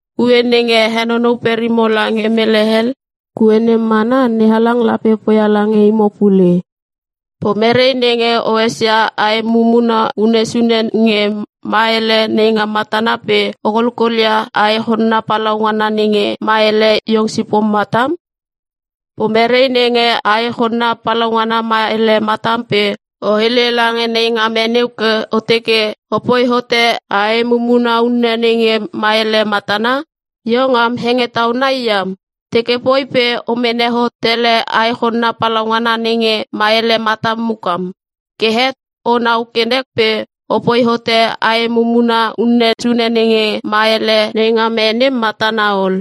Kue nenge a henonou perimo lange mele hel kue nem mana NeHalang lape poia lange imo pule. “Pomere nenge o esia ae mumuna unne sune nge ma ele neingam matana pe o kolkolia ae chonna palaungana nenge ma ele iong sipom matam? Pomere nenge ae chonna palaungana ma ele matam pe o hele lange neingam e neu ke o teke o poi hote ae mumuna unne nenge ma ele matana? Iong am hengetau nai iam teke poi pe o mene hot tele ae chonna palaungana nenge ma ele matam mukam. Ke het o nau ke nek pe o poi hote ae mumuna unne sune nenge ma ele neingam e nem matana ol.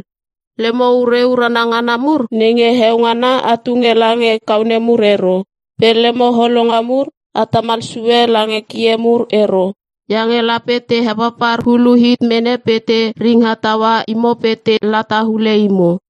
“Lemo ure urana ngana mur nenge heo ngana a tunge lange kaone mur ero. Pe lemo holonga mur a tamal sue lange kie mur ero. Iange lape te hepapar hulu hit mene pe te ringha taua imo pe te lata hule imo.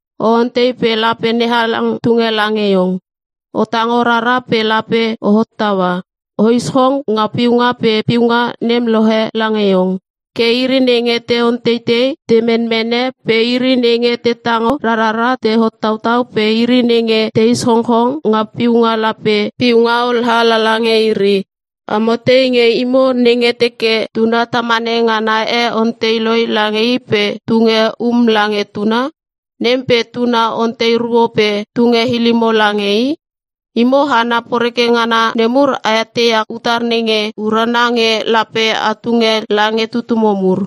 “O ontei pe lape NeHalang tunge lange iong. O tango rara pe lape o hottaua. O ischong nga piunga pe piunga nem lohe lange iong. Ke iri nenge te onteitei te menmene pe iri nenge te tango rarara te hottautau pe iri nenge te ischongchong nga piunga lape piunga olha lala nge iri. “Amo tei nge imo nenge teke tuna tamane ngana e ontei loi lange i pe tunge um lange tuna? Nem pe tuna ontei ruo pe tunge ilimo lange i? Imo hana poreke ngana nemur a eteia utar nenge urana nge lape a tunge lange tutumo mur.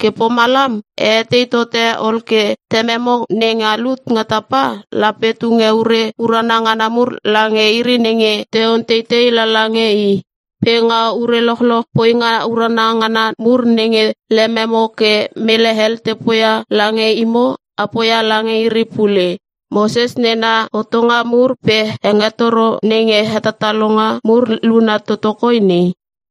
Ke pomalam a etei tote ol ke Tememo nenga lut nga tapa lape tunge ure urana ngana mur lange iri nenge te onteitei lala nge I. “Pe nga ure lochloch poinga urana ngana mur nenge lememo ke mele hel te poia lange imo a poia lange iri pule. Moses nena hotonga mur pe hengetoro nenge hetatalonga mur luna toto koi nei.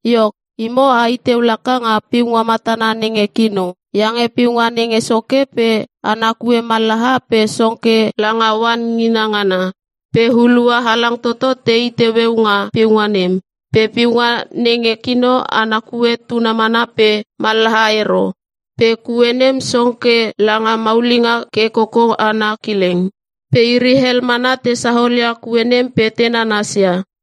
“Iok, imo a i teu laka nga piunga matana nenge kino. Iange piunga nenge soke pe ana kue mallaha pe song ke langa oan ngingina ngana. Pe hulua halang toto te i teueu nga piunga nem. Pe piunga nenge kino ana kue tuna mana pe mallaha ero. Pe kue nem song ke langa maulinga ke koko ana kileng. Pe iri hel mana te saolia kue nem pe te nanasia.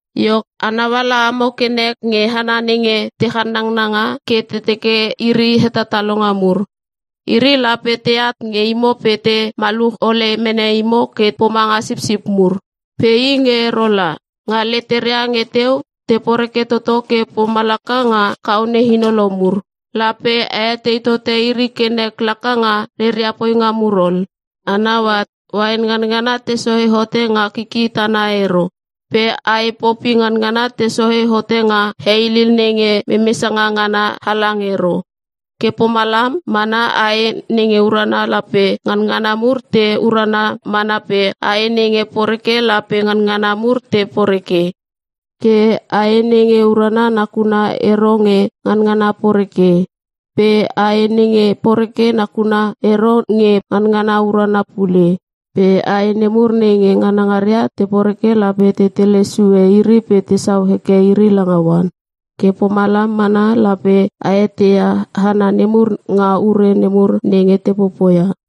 “Iok, a nauala amo ke nek nge hana nenge te channangnanga ke te teke iri hetatalonga mur. Iri lape teat nge imo pe te maluch ole mene imo ke pomanga sipsip mur. Pe i nge ero la. Nga leteria nge teu te poreke toto ke pomalaka nga kaone hinolo mur. Lape a etei tote iri ke nek laka nga reria poinga mur ol. A nau at, uain nganangana te sohe hote nga kiki tana ero. Pe ae Popi nganangana te sohe hote nga heilil nenge memesanga ngana halang ero. Ke pomalam mana ae nenge urana lape nganangana mur te urana mana pe ae nenge poreke lape nganangana mur te poreke. Ke ae nenge urana nakuna ero nge nganangana poreke. Pe ae nenge poreke nakuna ero nge nganangana urana pule. Pe ae nemur nenge nganangaria te poreke lape te tele sue iri pe tesau heke iri langa oan. Ke pomalam mana lape a eteia hana nemur nga ure nemur nenge te popoia.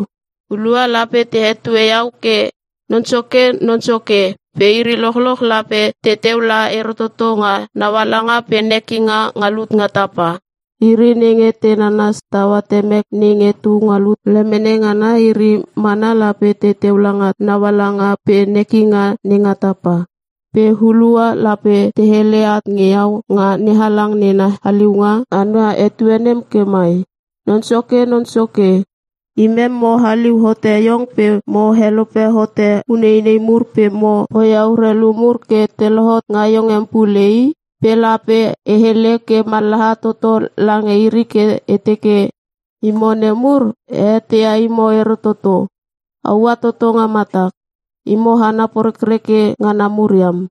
“Hulua lape te hetue iau ke ‘Non Soke Non Soke’ pe iri lochloch lape teteu la ero toto nga naualanga pe nekinga nga lut nga tapa. Iri nenge te nanas taua Temek nenge tu nga lut lemene ngana iri mana lape teteu langa naualanga pe nekinga nenga tapa. Pe hulua lape te hele at nge iau nga NeHalang nena haliunga ana etue nem ke mai, ‘Non Soke, Non Soke, imem mo haliu hote iong pe mo helope hote uneinei mur pe mo poia urelu mur ke te lohot nga iong em pule i.’ Pe lape e hele ke mallaha toto lange iri ke e teke, ‘Imo nemur, e eteia imo ero toto. A ua toto nga matak. Imo hana porekreke ngana mur iam.’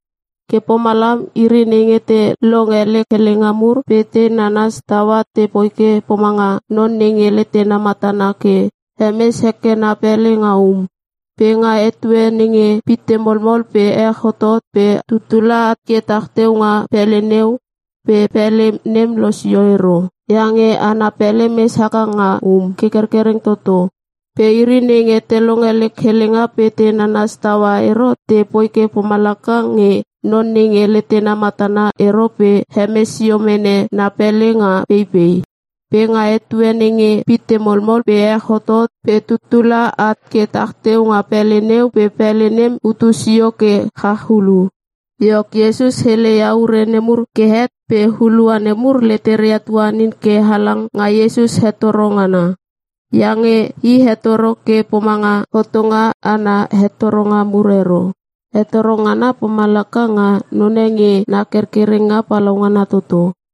“Ke pomalam iri nenge te longe lek helenga mur pe te nanas taua te poi ke pomanga non nenge letena matana ke hemes heke na pele nga um. Pe nga etue nenge pitte molmol pe ech hotot pe tuttula at ke tah teu nga pele neu pe pele nem losio ero. Iange ana pele mes haka nga um ke kerkereng toto. Pe iri nenge te longe lek helenga pe te nanas taua ero te poi ke pomalaka nge non nenge letena matana ero pe hemes sio mene na pele nga peipei. Pe nga etue nenge pitte molmol pe ech hotot pe tuttla at ke tah teu nga pele neu pe pele nem hutu sio ke chach hulu.” Iok, Iesus hele ia ure nemur ke het pe hulua nemur leteria tuanin ke halang nga Iesus hetoro ngana. Iange i hetoro ke pomanga hotonga ana hetoronga mur ero. Hetoro ngana pomalaka nga none nge na kerkerenga palaungana toto.